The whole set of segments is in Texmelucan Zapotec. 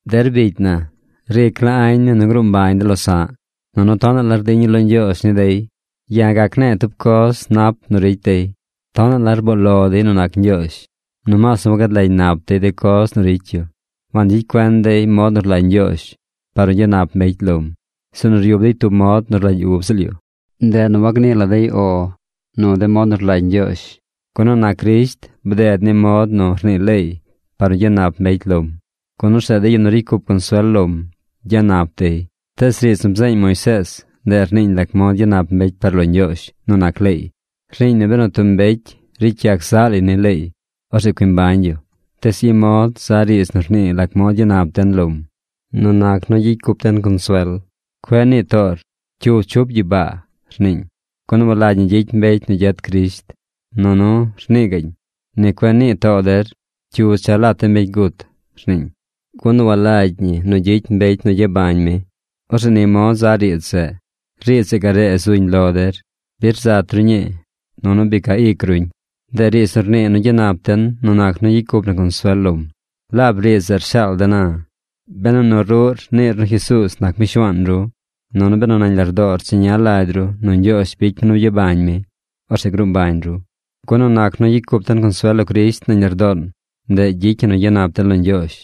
Der bicy na, ric la añ ne̱ nu gruu mbañ de losa̱ꞌ. Nunu tonaꞌ la rdiña̱ lo Ñgyoozh ni dey. Ya̱ gac ne̱e̱ tub coz nap nu ricy dey: tonaꞌ la rboo lo dey nu nac Ñgyoozh. Nomaas nu wagad lagy nap dey de coz nu ricy yu. Wangyicy cuen dey mod nu rlagy Ñgyoozh par nu gyanap mbecy lom, sinu ryub dey tub mod nu rlagy ub ziꞌl yu. Ndeꞌ nu wagnii la dey “O” nu mod nu rlagy Ñgyoozh. Gun nu nac Crisht, bded ni mod nu rnii leey par nu gyanap mbecy lom, gun orzeꞌ de yu nu ricy cup consuel lom gyanap dey. Tees riidz nu bzeeñ Moisees, ndeꞌ rniiñ lac mod gyanap mbecy par lo Ñgyoozh nu nac leey. Rniiñ nu benu tub mbecy ricy yac zaꞌ lay ni leey, orzeꞌ cui mbañ yu. Tees i mod za riidz nu rnii lac mod gyanap den lom nu nac nu gyicy cup den consuel: “Cueꞌ nii toor, ¿cyu chup gyibaa?” rniiñ. Gun walagy ñi gyicy mbecy nu gyet Crisht. Nunu; rnii gaꞌñ: “Ni cueꞌ nii too der, ¿cyu cha lat de mbecy gut?” rniiñ. Gun walagy ñi nu gyicy mbecy nu gyabañ mi. Orzeꞌ ni mod za riidz zeꞌ: “Riidz zeꞌ garee zuñ lo der. Bi rzat ru ñii. Nunu bi ca ic ruñ.” Ndeꞌ riidz nu rnii nu gyanap den nu nac nu gyicy cup na consuel lom. Laab riidz zeꞌ rshaal de̱ na. Benu nu ruꞌr niir nu Jesuuz nac mi Shuaan ru, nunu benu nañ lardoor cheña lagy ru nu Ñgyoozh bicy mi nu byabañ mi, orzeꞌ gruu mbañ ru. Gun nu nac nu gyicy cup den consuel lo Crisht nañ lardoon, ndeꞌ gyicy ñi nu gyanap den lo Ñgyoozh.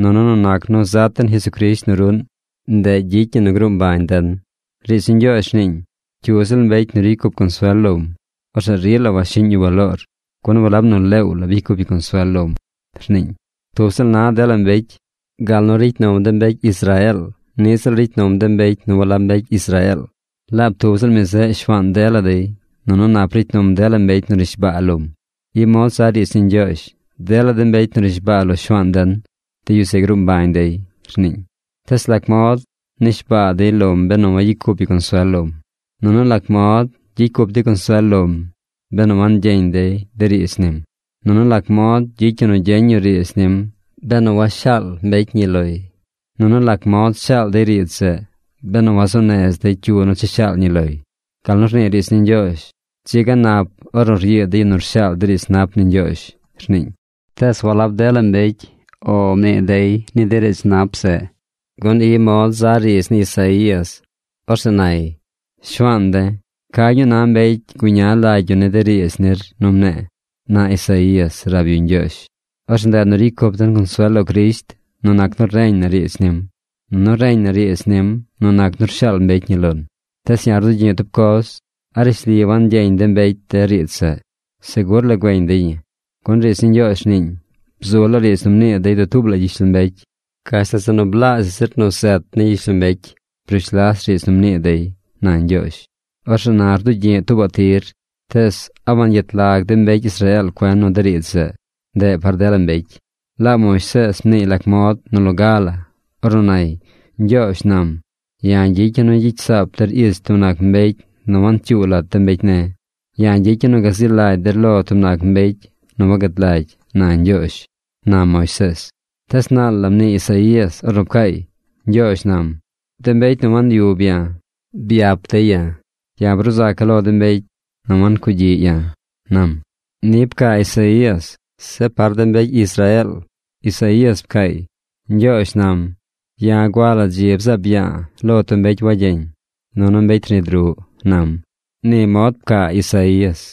Nunu nu nac nu zat den Jesucrisht nu ruꞌn, ndeꞌ gyicy ñi nu gruu mbañ den. Riidz ni Ñgyoozh rniiñ: “Cyu ziꞌl mbecy nu ricy cup consuel lom, orzeꞌ rila washiꞌñ yu baloor, gun walab nu leew bicy cup yu consuel lom”, rniiñ. Tub ziꞌl na dela mbecy. Gal nu ricy num de mbecy Israeel niꞌ ziꞌl ricy num de mbecy nu walab mbecy Israeel. Laab tub ziꞌl mi zeꞌ Shuaan dela dey, nunu nap ricy num dela mbecy nu nishbaa lom. I mod za riidz ni Ñgyoozh: “Dela de mbecy nu rnishbaa lo Shuaan den, de yu zeꞌ gruu mbañ dey”, rniiñ. Tees ¿lac mod nishbaa dey lom benu wagyicy cup yu consuel lom? Nunu ¿lac mod gyicy cup dey consuel lom benu wangyeñ dey de riidz nim? Nunu ¿lac mod gyicy yu nu gyeñ yu riidz nim benu washaal mbecy ñi loy? Nunu ¿lac mod shaal dey riidz zeꞌ benu wazuu nez dey cyu nu cha shaal ñi loy? Gal nu rnii riidz ni Ñgyoozh: “Dzi ga nap ornu ryiid de yu nu rshaal de riidz nap ni Ñgyoozh”, rniiñ. Tees walab dela mbecy “O” mnii dey ni de riidz nap zeꞌ, gun i mod za riidz ni Isaías. Orzeꞌ nay: “Shuaan de̱, ¿ca ñuu na mbecy guña lagy yu de riidz nir nu mne̱e̱?” na Isaías rab yu Ñgyoozh. Orzeꞌ ndeꞌ nu ricy cup den consuel lo Crisht nu nac nu reñ na riidz nim. Nunu reñ na riidz nim nu nac nu rshaal mbecy ñi lon. Tees ya̱ rdugyi̱ꞌ tub coz: ¿a rishli wangyeñ de mbecy de riidz zeꞌ? Segur la güeñ dey ñi. Gun riidz ni Ñgyoozh rniiñ: Bzu laa riidz nu mnii dey dutuub la gyishlombecy. Gashtal zeꞌ nu blaazhaꞌ zir nu zet ni gyishlombecy brush las riidz nu mnii dey, na Ñgyoozh. Orzeꞌ na rdugyi̱ꞌ tuubaꞌ tir: Tees ¿a wangyet lag de mbecy Israeel cuen nu de riidz zeꞌ, ndeꞌ par dela mbecy? Laab Moisees mniiy lac mod nu loga la. Ornu nay: Ñgyoozh nam: “Ya̱ gyicya̱ nu gyicy saap der ich tub nac mbecy nu wancyuu lat de mbecy ne̱. Ya̱ gyicya̱ nu gazi lagy der lo tub nac mbecy nu wagad lagy”, na Ñgyoozh, na Moisees. Despuees naal la mnii Isaías ornu pcaay: Ñgyoozh nam: “De mbecy nu wanyub ya̱, byap dey ya̱. Ya̱ bruu zaca̱ lo de mbecy nu wancugyiꞌ ya̱”, nam. Ni pcaa Isaías. Zeꞌ par de mbecy Israeel, Isaías pcaay: “Ñgyoozh nam: Ya̱ gua la dzi bzaab ya̱a̱ lo tub mbecy wagyeñ, nunu mbecy rnid ruꞌ, nam.” Ni mod pcaa Isaías.